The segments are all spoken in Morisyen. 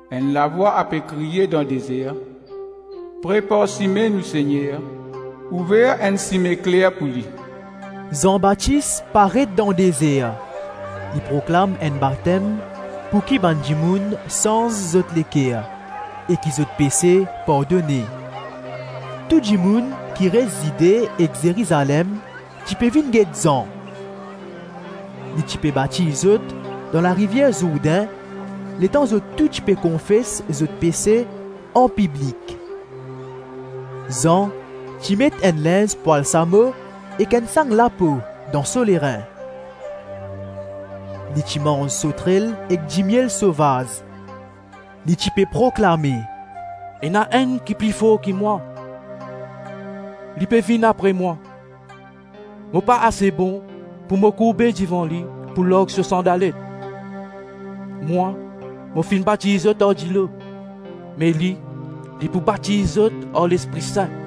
Enn lavwa ape kriye dan dezer, prepar sime Nou Segner, ouver enn sime kler pou li.” Zan Batis paret dan dezer; li proklam enn batem pouki bann dimoun sanz zot leker e ki zot pese pardone. Tou dimoun ki res Zide ek Zerizalem ti pe vinn get Zan. Li ti pe batiz zot dan larivier Zourdin letan zot tou ti pe konfes zot pese anpiblik. Zan ti met enn linz pwal samo ek enn sang lapo dan so lerin. Li ti manz sotrel ek dimiel sovaz. Li ti pe proklame, “Ena enn ki pli for ki mwa, li pe vinn apre mwa; mo pa ase bon, pou mo kourbe devan li, pou larg so sandalet. Mwa, mo finn batiz zot ar dilo, me li, li pou batiz zot ar Lespri Sin.”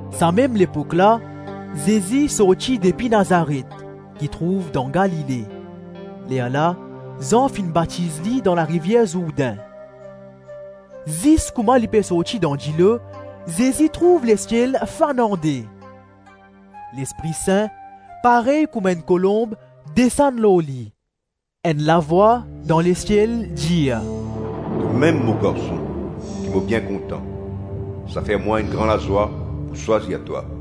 Samem lepok la, Zezi sorti depi Nazaret, ki trouv dan Galile; lerla Zan finn batiz li dan larivier Zourdin. Zis kouma li pe sorti dan dilo, Zezi trouv lesiel fann an-de. Lespri Sin, parey kouma enn kolonb, desann lor li. Enn lavwa, dan lesiel dir, “Tomem mo Garson, ki mo bien kontan; sa fer mwa enn gran lazwa pou swazir twa.”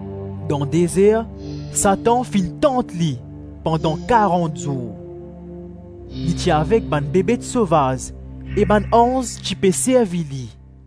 Dan dezer, Satan finn tant li, pandan karant zour. Li ti avek bann bebet sovaz e bann anz ti pe servi li.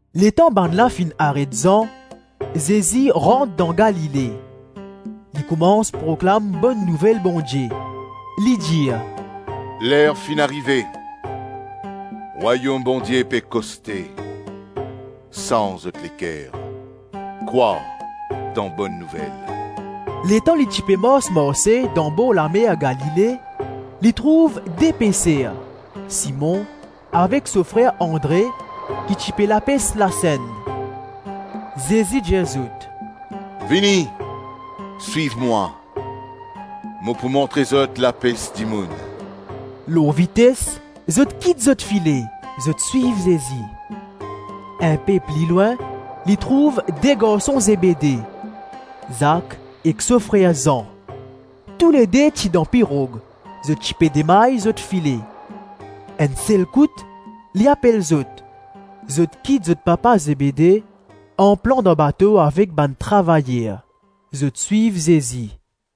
Letan bannla finn aret Zan, Zezi rant dan Galile. Li koumans proklam Bonn Nouvel Bondie. Li dir: “Ler finn arive, Rwayom Bondie pe koste. Sanz zot leker, krwar dan Bonn Nouvel.” Letan li ti pe mars-marse dan borlamer Galile, li trouv de peser, Simon, avek so frer Andre ki ti pe lapes lasenn. Zezi dir zot, “Vini, swiv mwa; mo pou montre zot lapes dimoun.” Lor vites, zot kit zot file, zot swiv Zezi. Inpe pli lwin, li trouv de garson Zebede: Zak ek so frer Zan. Toulede ti dan pirog; zot ti pe demay zot file. Enn sel kout, li apel zot; zot kit zot papa Zebede anplan dan bato avek bann travayer. Zot swiv Zezi.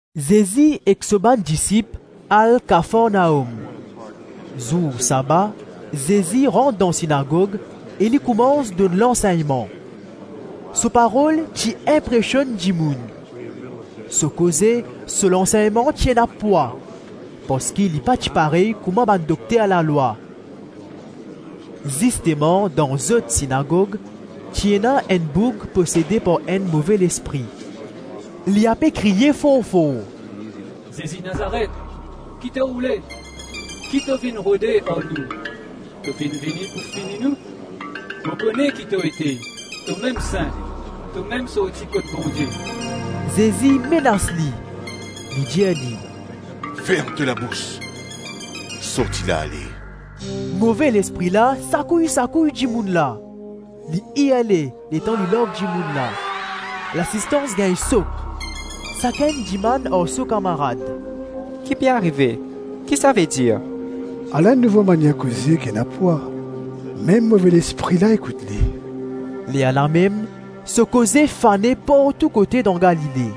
Zezi ek so bann disip al Kafarnaom. Zour saba, Zezi rant dan sinagog e li koumans donn lansegnman. So parol ti inpresionn dimoun. So koze, so lansegnman ti ena pwa parski li pa ti parey kouma bann dokter lalwa. Zisteman dan zot sinagog, ti ena enn boug posede par enn move lespri. Li ape kriye for-for: “Zezi Nazaret, ki to oule, ki to vinn rode ar nou? To finn vini pou fini nou? Mo kone ki to ete: tomem Sin, tomem sorti kot Bondie.” Zezi menas li. Li dir li: “Ferm to labous; sorti la, ale.” Move lespri la sakouy-sakouy dimoun la. Li irle letan li larg dimoun la. Lasistans gagn sok; sakenn dimann ar so kamarad, “Ki pe arive, ki sa vedir? Ala enn nouvo manier koze ki ena pwa. Mem move lespri la ekout li.” Lerlamem so koze fane partou kote dan Galile.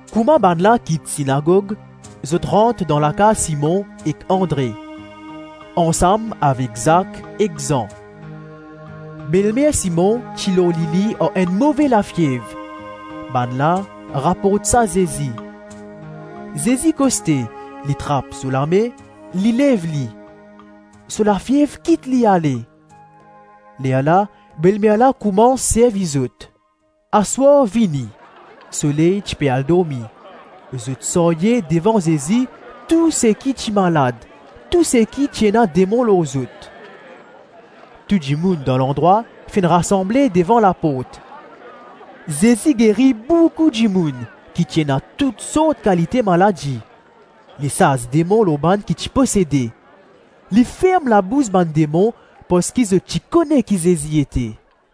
Kouma bannla kit sinagog, zot rant dan lakaz Simon ek Andre, ansam avek Zak ek Zan. Belmer Simon ti lor lili ar enn move lafiev. Bannla raport sa Zezi. Zezi koste, li trap so lame, li lev li. So lafiev kit li ale. Lerla belmer la koumans servi zot. Aswar vini, soley ti pe al dormi, zot sarye devan Zezi tou seki ti malad, tou seki ti ena demon lor zot. Tou dimoun dan landrwa finn rasanble devan laport. Zezi geri boukou dimoun ki ti ena tout sort kalite maladi; Li sas demon lor bann ki ti posede. Li ferm labous bann demon parski zot ti kone ki Zezi ete.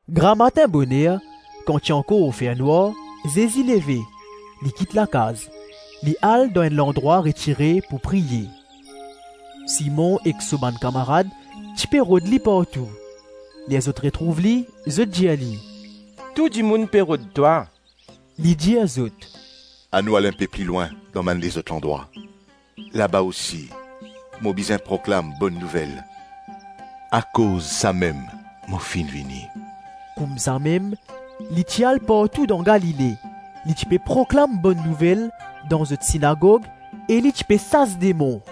Gramatin boner, kan ti ankor fer nwar, Zezi leve, li kit lakaz, li al dan enn landrwa retire pou priye. Simon ek so bann kamarad ti pe rod li partou. Ler zot retrouv li, zot dir li, “Tou dimoun pe rod twa.” Li dir zot, “Anou al inpe pli lwin dan bann lezot landrwa; laba osi, mo bizin proklam Bonn Nouvel. Akoz samem mo finn vini.” Koumsamem li ti al partou dan Galile, li ti pe proklam Bonn Nouvel dan zot sinagog e li ti pe sas demon.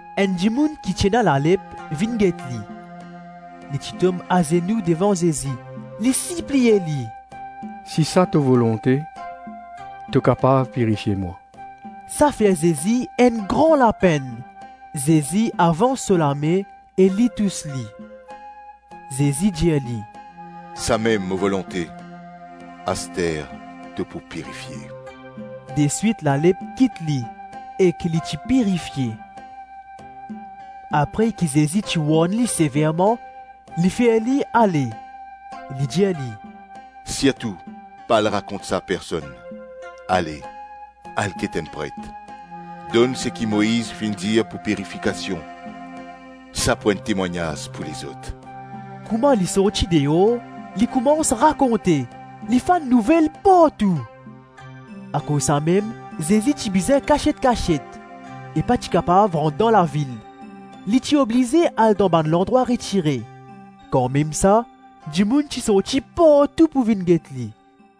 Enn dimoun ki ti ena lalep vinn get li. Li ti tom azenou devan Zezi, li sipliye li, “Si sa to volonte, to kapav pirifie mwa.” Sa fer Zezi enn gran lapenn; Zezi avans so lame e li tous li. Zezi dir li, “Samem mo volonte, aster to pou pirifie.” Deswit lalep kit li, ek li ti pirifie. Apre ki Zezi ti warn li severman, li fer li ale. Li dir li: “Sirtou pa al rakont sa personn; ale, al get enn pret; donn seki Moiz finn dir pou pirifikasion; sa pou enn temwagnaz pou lezot.” Kouma li sorti deor, li koumans rakonte, li fann nouvel partou. Akoz samem Zezi ti bizin kasiet-kasiet e pa ti kapav rant dan lavil; li ti oblize al dan bann landrwa retire; kanmem sa, dimoun ti sorti partou pou vinn get li.